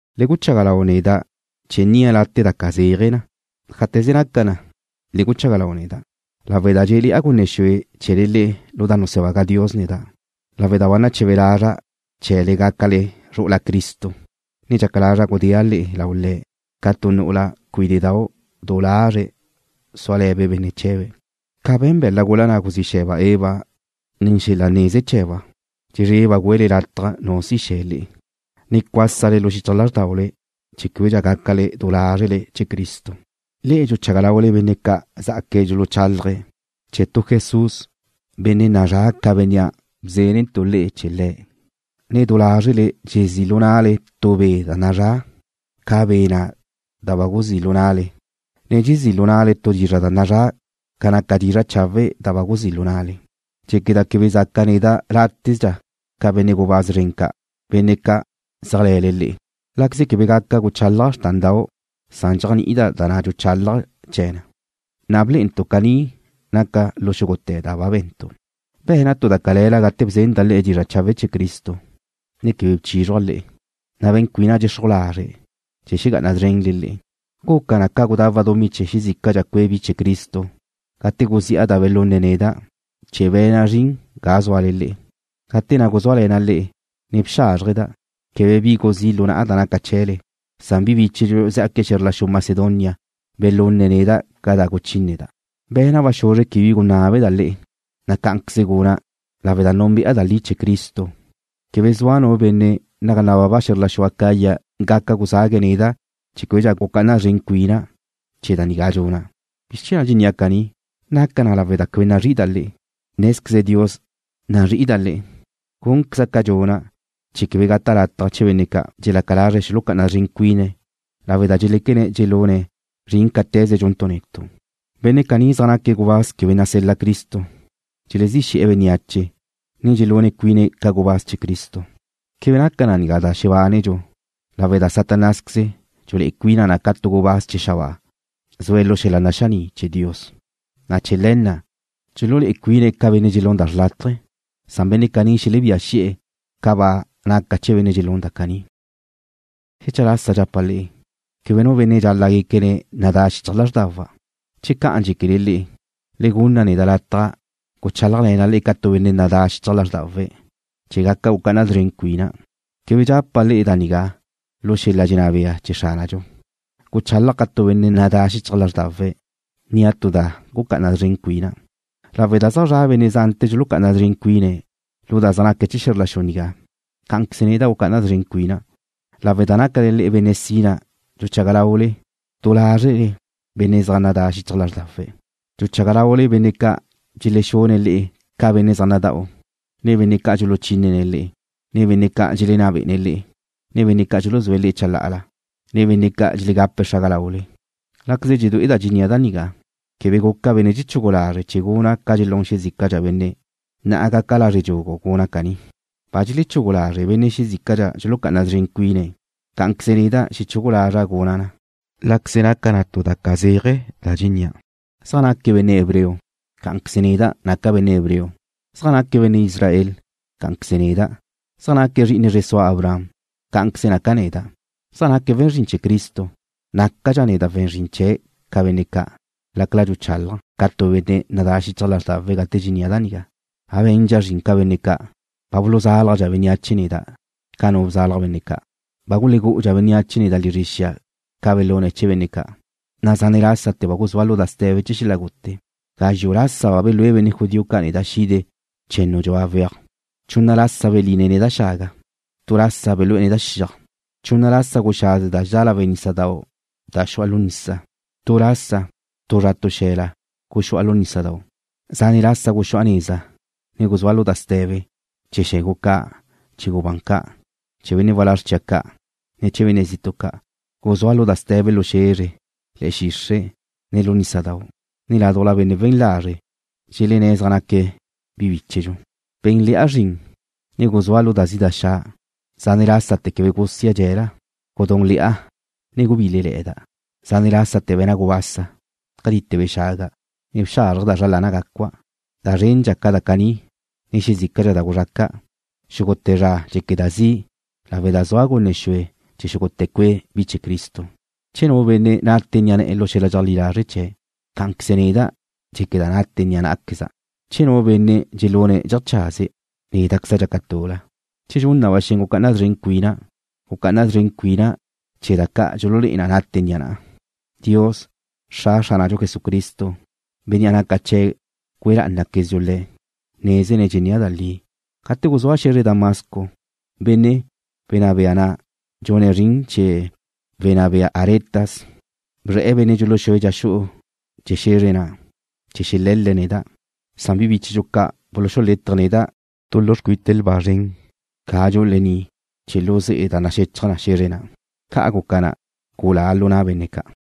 Le guchaga lau neda' chee̱ nnia' late' da ca zeaje na. Ájate̱ze naca na, le guchaga lau neda', lawe' da dxé'le̱'a gunne xue chee̱le le'e lu da nusebaga Dios neda', ne lawe' da ba nache̱be lazra' chee̱le gácale zru'ula Cristo, dxaca lazra' gudéa' le'e lau Le̱' ca tu nu'ula cuíde'dau' du lazre' súale̱be' benne' chee̱be'. Ca be̱n be̱la' gula na' guzí xe̱ba' Eva nen xel-la neze chee̱ba', dxezreba' güele lataj nu si xe̱ le'e, na' cuásale lu xichaj lázrdaule chee̱ québedxa gácale du lázrele chee̱ Cristo. Le'e dxuchaga laule benne' ca' zá'aque̱' dxuluchálaje̱' chee̱ tu Jesús, benne' nazrá' ca Bénnea' bzénentu' le'e chee̱ Le̱', ne du lázrele dxezí' lu na'le tu be' da nazrá' ca Be' na' da ba guzí' lu na'le, ne dxezí' lu na'le tu dizra' da nazrá' ca naca dizra' chawe' da ba guzí' lu na'le. Dxéqueda' quebe zaca' neda' látezdxa ca benne' gubáz zren ca', benne' ca' zéajle̱le le'e. Láqueze quebe gaca guchálaja' xrtándau', dxéajni'ida' da na' dxuchálaja' chee̱ na, na' blé'entu' caní naca na lu xúgute̱ da ba be̱ntu'. ¿Be̱na' tu da cale̱la gate bzenda' le'e dizra' chawe' chee̱ Cristo, ne quebe bi bchízruja' le'e, na' be̱n cuina' dxexruj lazre' chee̱ xegá'ana szrenle le'e? Guca na ca gudawa' dumí chee̱ xezícadxa cue' bi chee̱ Cristo gate guzi'a da belunne̱' neda' chee̱ be̱na' zrin ga zúale le'e. Gate na' guzúale̱na' le'e, ne bxázrjeda', quebe bi guzí' lu na'a da naca chee̱le, san bi bíchedxu zá'aque̱' xe̱zr la xu Macedonia belunne̱' neda' ca da guchínneda'. Be̱na' ba xuzre quebe bi gunábeda' le'e, na' cá'anqueze guna'. Lawe' da núnbe'a da li chee̱ Cristo, quebe zua nu benne' naga nababa xe̱zr la xu Acaya gaca guzague̱' neda' chee̱ québedxa gucá'ana szren cuina' chee̱ da nigá dxuna'. ¿Bizr chee̱ na' dxennía' caní? ¿Naca na lawe' da quebe nazrí'ida' le'e? Nézqueze Dios nazrí'ida' le'e. Gúnqueza' ca dxuna' chee̱ quebe gata' lataj chee̱ benne' ca' dxelaca lazre̱' xulucá'ana szren cuine̱' lawe' da dxeléquene̱' dxelune̱' zrin cáte̱ze dxuntu' netu'. Benne' caní zaj naque̱' gubáz quebe nasel-la Cristo. Dxelezí xe̱'e̱ bénneache, ne dxululé'e cuine̱' ca gubáz chee̱ Cristo. Quebe naca da nigá da xebánedxu lawe' da Satanásqueze dxulé'e cuina na ca tu gubáz chee̱ xabáa zue̱' lu xel-la naxaní' chee̱ Dios, na' chee̱ le̱ na' dxululé'e cuine̱' ca benne' dxelún da xrlátaje. Benne' caní xelebía xi'e̱ ca ba naca chee̱ benne' dxelún da caní. Xecha lasa dxapa' le'e, quebe nu benne' dxal-la' guéquene̱' nadá xichaj lázrdawa'. Che ca'an dxéquele le'e, le gunna neda' lataj guchálajle̱na' le'e ca tu benne' nadá xichaj lázrdawe̱', chee̱ gaca gucá'ana szren cuina'. Quebe dxapa' le'e da nigá lu xel-la dxenná bea chee̱ Xránadxu. Guchálaja' ca tu benne' nadá xichaj lázrdawe̱', nnia' tu da gucá'ana szren cuina'. Lawe' da zaj zra' benne' zante̱ dxulucá'ana szren cuine̱' lu da zaj naque̱' chee̱ xe̱zr la xu nigá, cá'anqueze neda' gucá'ana szren cuina'. Lawe' da nácale̱'e̱le benne' sina dxuchaga laule du lázrele benne' zaj nadá xichaj lázrdawe̱'. Dxuchaga laule benne' ca' dxelexune̱' le'e ca benne' zaj nada'u, ne benne' ca' dxuluchínene̱' le'e, ne benne' ca' dxelenná bé'ene̱' le'e, ne benne' ca' dxuluzúe̱' le'e chalá'ala, ne benne' ca' dxelegape̱' xraga laule. Láqueze dxedué'eda' dxennía' da nigá, quebe guca' benne' dxechugu lazre' chee̱ guna' ca dxelún xezícadxa benne'. Na'a gaca' lazre' dxugu guna' caní. Ba dxelechugu lazre' benne' xezícadxa dxulucá'ana szren cuine̱'. Cá'anqueze neda' xechugu lazra' guna' na, láqueze naca tu da ca zeaje da dxennía'. ¿Zaj naque̱' benne' hebreo? Cá'anqueze neda' naca' benne' hebreo. ¿Zaj naque̱' benne' Israel? Cá'anqueze neda'. ¿Zaj naque̱' zri'ine zre sua Abraham? Cá'anqueze naca' neda'. ¿Zaj naque̱' we̱n zrin chee̱ Cristo? Nácadxa' neda' we̱n zrin chee̱' ca benne' ca', lácala dxuchálaja' ca tu benne' nadá xichaj lázrdawe̱' gate dxennía' da nigá. Ba be̱ndxa' zrin ca benne' ca'. Ba buluzálajdxa bénneache neda' ca nu bzálaj benne' ca'. Ba gulegu'udxa bénneache neda' lizre xia ca belune̱' chee̱ benne' ca', na' zane' lásate̱ ba guzúa' lu da ste̱be chee̱ xel-la gute. Gazxu' lasa ba belúe benne' judío ca' neda' xide che̱nnu dxua weaj. Chunna lasa beline̱' neda' xaga. Tu lasa belú'e̱ neda' xiaj. Chunna lasa guxaze da dxedá lawe' nísadau' da xu'a lu nisa. Tu lasa, tu zra tu xe̱la guxu'a lu nísadau'. Zane' lásate̱ guxu'a neza, ne guzúa' lu da ste̱be: Chee̱ xe̱gu ca', ne chee̱ gubán ca'. Chee̱ benne' walázr chia' ca', ne chee̱ benne' zitu' ca'. Guzúa' lu da ste̱be lu xe̱zre, ne le̱'e̱ xixre', ne lu nísadau', ne ládujla benne' we̱n lazre' dxelenné̱' zaj naque̱' bi bíchedxu. Be̱nle̱'a zrin, ne guzúa' lu da zi' da xa'. Zane' lásate̱ quebe gusia' dxe̱la. Gudúnle̱'a, ne gubílele̱'e̱da', na' zane' lásate̱ be̱na' gubasa. Catite̱ bexaga', ne bexázrjeda' zra lana' gacua'. Da zrendxa ca da caní, ne xezícadxa da guzraca'. Xúgute̱ zra dxéqueda' zi' lawe' da zua' gunne xue chee̱ xúgute̱ cue' bi chee̱ Cristo. Che nu benne' nate ni'a ne̱'e̱ lu xel-la dxeajlí lazre' chee̱', cá'anqueze neda' dxéqueda' nate ni'a ná'aqueza'. Che nu benne' dxelune̱' dxeajchaze̱', néda'queze dxaca' tul-la. Che dxun na ba xen gucá'ana szren cuina', gucá'ana szren cuina' chee̱ da ca' dxululé'e na nate ni'a na'a. Dios, Xra Xránadxu Jesucristo, Bénnea' naca chee̱' güe lá'anatequezdxu Le̱', nézene̱' dxennía' da li. Gate guzúa' xe̱zre Damasco, benne' wnná bea na' dxune' zrin chee̱ wenná bea Aretas bzre̱'e̱ benne' dxuluxúe̱' dxa xu'u chee̱ xe̱zre na', chee̱ xele̱l-le̱' neda'. Na' bi bíchedxu ca' bululetje̱' neda' tu lu xcuite xia ga dxu'u lení' chee̱ xu'u lu ze'e da naxechaj na xe̱zre na'. Ca' guca na, gulá' lu na' benne' ca'.